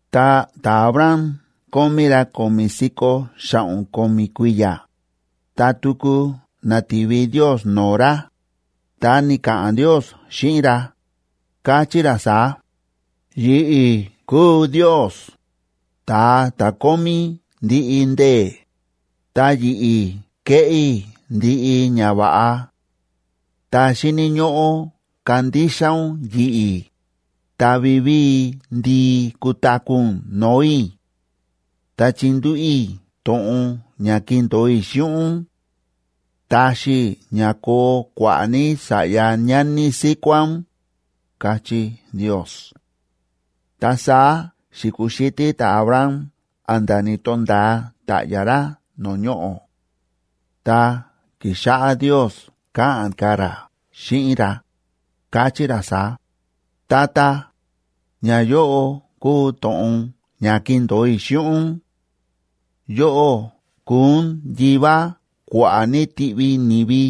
Ta ta̱Abram kómí ra ko̱mi̱ si̱ko̱ xa̱ꞌo̱n ko̱mi̱ kui̱ya̱, ta tuku na̱ti̱vi Ndiosa no̱o̱ ra, ta ni̱ka̱ꞌa̱n Ndios xíꞌin ra, káchí ra saá: ―Yi̱ꞌi̱ kúu Ndios, Ta̱a ta̱ Kómí Ndiꞌi Ndee̱, ta yi̱ꞌi̱ kéꞌé i̱ ndiꞌi ñava̱ꞌa. Ta xíni̱ ñóꞌó kandixa ún yi̱ꞌi̱, ta vivíi ndii kutaku̱ ún no̱o̱ i̱. Ta chindúꞌu̱ i̱ to̱ꞌon ña kindo̱o i̱ xíꞌin ún. Taxi i̱ ña koo kua̱ꞌa̱ ní sa̱ꞌya ñani síkuá ún ―káchí Ndios. Ta saá xi̱kuxítí ta̱Abram a̱nda̱ ni̱to̱nda̱a ta̱ꞌya̱ ra no̱o̱ ñoꞌo̱. Ta ki̱xáꞌá Ndios káꞌa̱n ka̱ ra xíꞌin ra, káchí ra saá: Tata, ñayóꞌo kúu to̱ꞌon ña kíndo̱o i̱ xíꞌin ún: yóꞌó kuu ún yivá kua̱ꞌa̱ ní tiꞌvi ni̱vi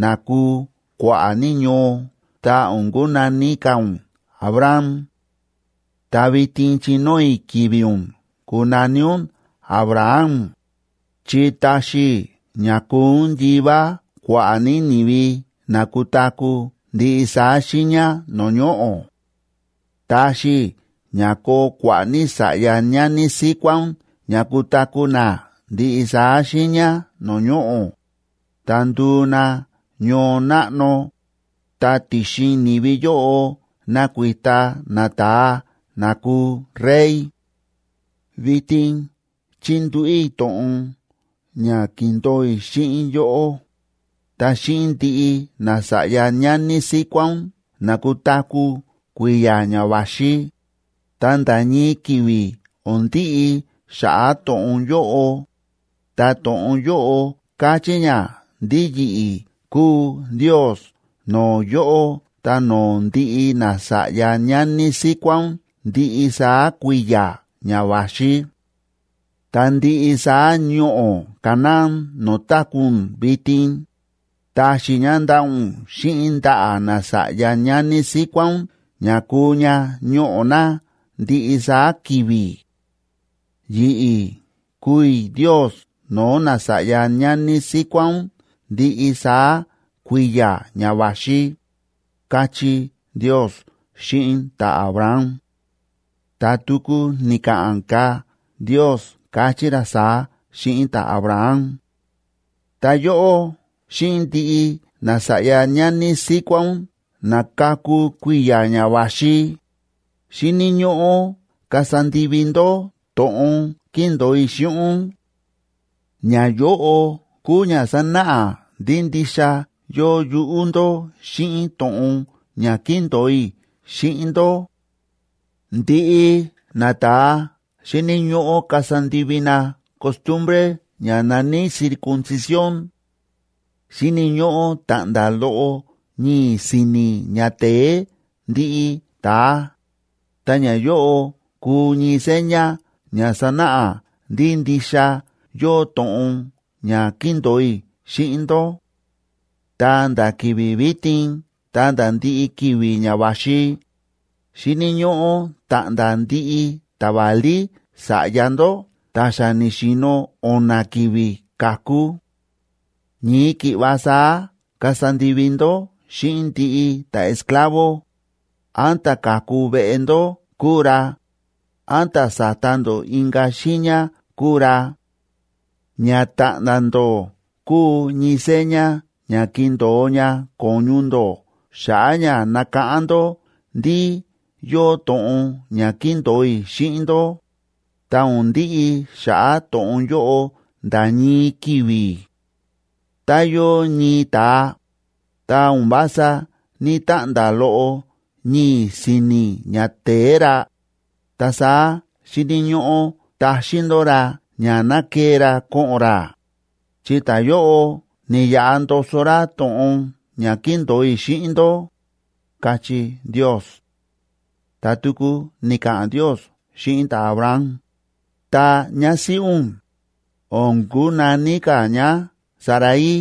na kuu kua̱ꞌa̱ ní ñoo, ta o̱n kunaní ka̱ ún Abram.b Ta vitin chinóo i̱ ki̱vi̱ ún kunaní ún Abraham,c chi taxi i̱ ña kuu ún yivá kua̱ꞌa̱ ní ni̱vi na kutaku̱ ndiꞌi saá xiiña no̱o̱ ñoꞌo̱. Taxi i̱ ña koo kua̱ꞌa̱ ní sa̱ꞌya ñani síkuá ún ña kutaku̱ na ndiꞌi saá xiiña no̱o̱ ñoꞌo̱, ta nduu na ñoo náꞌno, ta ti̱xin ni̱vi yóꞌo nakuita nata̱a na kuu rey. Vitin chíndúꞌu̱ i̱ to̱ꞌon ña ki̱ndo̱o i̱ xíꞌin yóꞌó, ta xíꞌin ndiꞌi nasa̱ꞌya ñani síkuá ún na kutaku̱ kui̱ya̱ ña va̱xi, ta nda̱ ñii ki̱vi̱ o̱n ndiꞌi xa̱ꞌa̱ to̱ꞌon yóꞌo. Ta to̱ꞌon yóꞌo káchí ña ndí yi̱ꞌi̱ kúu Ndios no̱o̱ yóꞌó ta no̱o̱ ndiꞌi nasa̱ꞌya ñani síkuá ún ndiꞌi saá kui̱ya̱ ña va̱xi. Ta ndiꞌi saá ñoꞌo̱ Canaán no̱o̱ táku̱ ún vitin, taxi i̱ ña ndaꞌa̱ ún xíꞌin ndaꞌa̱ nasa̱ꞌya ñani síkuá ún ña kuu ña ñoꞌo̱ na ndiꞌi saá ki̱vi̱; yi̱ꞌi̱ kuu i̱ Ndios no̱o̱ nasa̱ꞌya ñani síkuá ún ndiꞌi saá kui̱ya̱ ña va̱xi, káchí Ndios xíꞌin ta̱Abraham. Ta tuku ni̱ka̱ꞌa̱n ka̱ Ndios, káchí ra saá xíꞌin ta̱Abraham: ―Ta yóꞌó xíꞌin ndiꞌi nasa̱ꞌya ñani síkuá ún na kaku kui̱ya̱ ña va̱xi, xíni̱ ñóꞌó kasa ndivi ndó to̱ꞌon kíndo̱o i̱ xíꞌin ún. Ñayóꞌo kuu ña sanáꞌa ndí ndixa yóo yuꞌú ndó xíꞌin to̱ꞌon ña kíndo̱o i̱ xíꞌin ndó: Ndiꞌi nata̱a xíni̱ ñóꞌó kasa ndivi na costumbre ña na̱ní circuncisión. Xíni̱ ñóꞌó ta̱ꞌnda̱ loꞌo ñii̱ si̱ni̱ ñate̱e ndiꞌi ta̱a, ta ñayóꞌo kuu ñii seña ña sanáꞌa ndí ndixa yóo to̱ꞌon ña kíndo̱o i̱ xíꞌin ndó. Ta nda̱ ki̱vi̱ vitin ta̱nda̱ ndiꞌi ki̱vi̱ ña va̱xi, xíni̱ ñóꞌó ta̱ꞌnda̱ ndiꞌi ta̱válí sa̱ꞌya ndó ta̱ xa ni̱xi̱no̱ o̱na̱ ki̱vi̱ ka̱ku. Ñii ki̱ꞌva saá kasa ndivi ndó xíꞌin ndiꞌi ta̱esclavo,d án ta̱ ka̱ku veꞌe ndó kúu ra, án ta̱ sa̱ta ndó inka̱ xiiña kúu ra. Ña ta̱ꞌnda̱ ndó kuu ñii seña ña kindo̱o ña ko̱ñu ndó xa̱ꞌa̱ ña nakáꞌán ndó ndí yóo to̱ꞌon ña kíndo̱o i̱ xíꞌin ndó, ta o̱n ndiꞌi xa̱ꞌa̱ to̱ꞌon yóꞌo nda̱ ñii ki̱vi̱. Tá yóo ñii ta̱a, tá o̱n vása ní‑taꞌnda̱ loꞌo ñii̱ si̱ni̱ ñate̱e ra, ta saá xíni̱ ñóꞌó taxín ndó ra ña ná kee ra ko̱ꞌo̱n ra, chi ta̱yóꞌo ni̱yaꞌa ndoso ra to̱ꞌon ña kíndo̱o i̱ xíꞌin ndó ―káchí Ndios. Ta tuku ni̱ka̱ꞌa̱n Ndios xíꞌin ta̱Abraham: Ta ñásíꞌí ún, o̱n kunaní ka̱ ñá Sarai.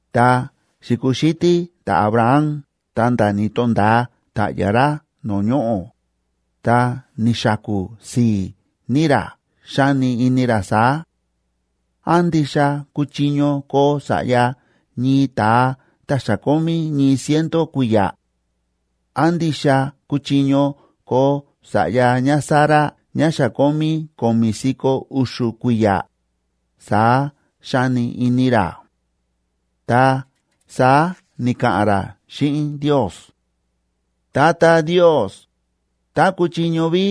Ta xi̱kuxítí ta̱Abraham ta̱nda̱ ni̱to̱nda̱a ta̱ꞌya̱ ra no̱o̱ ñoꞌo̱, ta ni̱xaku̱ si̱i̱ ní ra, xáni ini ra saá: “¿Án ndixa kuchiño koo sa̱ꞌya ñii ta̱a ta̱ xa kómí ñii ciento kui̱ya̱? ¿Án ndixa kuchiño koo sa̱ꞌya ñáSara ñá xa kómí ko̱mi̱ si̱ko̱ u̱xu̱ kui̱ya̱?”, saá xáni ini ra. Ta saá ni̱ka̱ꞌa̱n ra xíꞌin Ndios: ―Tata Ndios, tá kuchiño ví,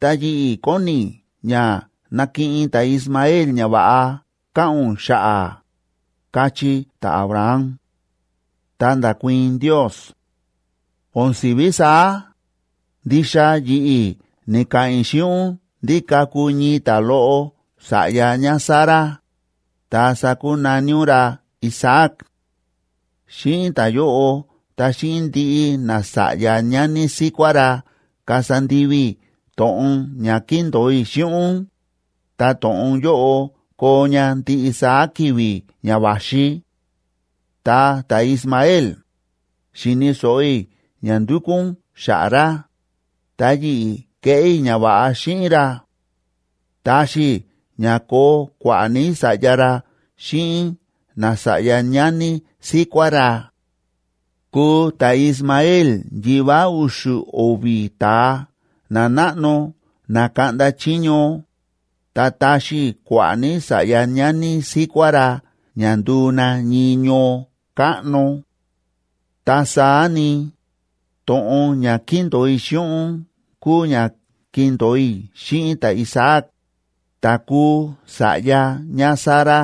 ta yi̱ꞌi̱ kóni i̱ ña nakiꞌin ta̱Ismael ñava̱ꞌa káꞌa̱n ún xa̱ꞌa̱ ―káchí ta̱Abraham. Ta nda̱kuii̱n Ndios: ―¡O̱n si̱ví saá! Ndixa yi̱ꞌi̱ ni̱ka̱ꞌa̱n i̱ xíꞌin ún ndí kaku ñii ta̱loꞌo sa̱ꞌya ñáSara, ta sakunaní ún ra Isaac.f Xíꞌin ta̱yóꞌo ta xíꞌin ndiꞌi nasa̱ꞌya ñani síkuá ra kasa ndivi i̱ to̱ꞌon ña kíndo̱o i̱ xíꞌin ún, ta to̱ꞌon yóꞌo koo ña ndiꞌi saá ki̱vi̱ ña va̱xi. Ta ta̱Ismael, xíni̱ so̱ꞌo i̱ ña ndúkú ún xa̱ꞌa̱ ra, ta yi̱ꞌi̱ keꞌé i̱ ñava̱ꞌa xíꞌin ra. Taxi i̱ ña koo kua̱ꞌa̱ ní sa̱ꞌya ra xíꞌin nasa̱ꞌya ñani síkuá ra. Kuu ta̱Ismael yivá u̱xu̱ o̱vi̱ ta̱a nanáꞌno na kaꞌnda chiño, ta taxi i̱ kua̱ꞌa̱ ní sa̱ꞌya ñani síkuá ra ña nduu na ñii ñoo káꞌno. Ta saá ni, to̱ꞌon ña kíndo̱o i̱ xíꞌin ún kúu ña kindo̱o i̱ xíꞌin ta̱Isaac, ta̱ kuu sa̱ꞌya ñáSara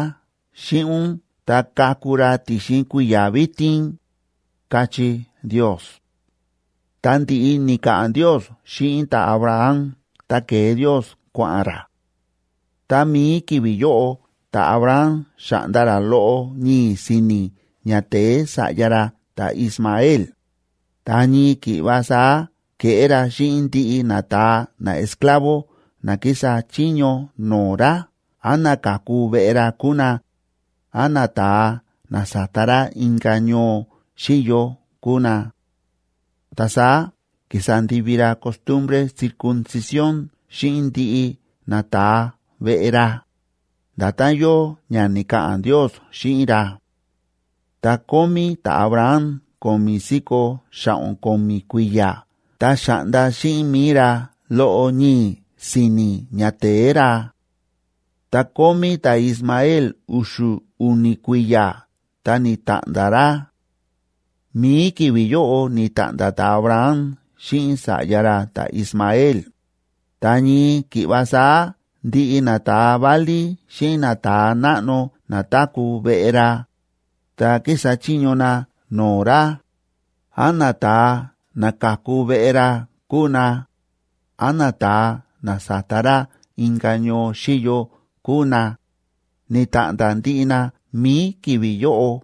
xíꞌin ún ta kaku ra ti̱xin kui̱ya̱ vitin ―káchí Ndios. Ta ndi̱ꞌi ni̱ka̱ꞌa̱n Ndios xíꞌin ta̱Abraham, ta ke̱e Ndios kua̱ꞌa̱n ra. Tá mií ki̱vi̱ yóꞌo ta̱Abraham xa̱ꞌnda ra loꞌo ñii̱ si̱ni̱ ñate̱e sa̱ꞌya ra ta̱Ismael, ta ñii ki̱ꞌva saá ke̱ꞌé ra xíꞌin ndiꞌi nata̱a naesclavo na kísa chiño no̱o̱ ra, án na ka̱ku veꞌe ra kúu na, án nata̱a na sa̱ta ra inka̱ ñoo xíyo kúu na. Ta saá ki̱sa ndivi ra costumbre circuncisión xíꞌin ndiꞌi nata̱a veꞌe ra, nda̱tán yóo ña ni̱ka̱ꞌa̱n Ndios xíꞌin ra. Ta kómí ta̱Abraham ko̱mi̱ si̱ko̱ xa̱ꞌo̱n ko̱mi̱ kui̱ya̱ ta xa̱ꞌnda xíꞌin mi̱i ra loꞌo ñii̱ si̱ni̱ ñate̱e ra. Ta kómí ta̱Ismael u̱xu̱ u̱ni̱ kui̱ya̱ ta ni̱ta̱ꞌnda̱ ra. Mi̱i ki̱vi̱ yóꞌo ni̱ta̱ꞌnda̱ ta̱Abraham xíꞌin sa̱ꞌya ra ta̱Ismael, ta ñii ki̱ꞌva saá ndiꞌi nata̱a válí xíꞌin nata̱a náꞌno na táku̱ veꞌe ra, ta kísa chiño na no̱o̱ ra, án nata̱a na ka̱ku veꞌe ra kúu na, án nata̱a na sa̱ta ra inka̱ ñoo xíyo kúu na, ni̱ta̱ꞌnda̱ ndiꞌi na mi̱i ki̱vi̱ yóꞌo.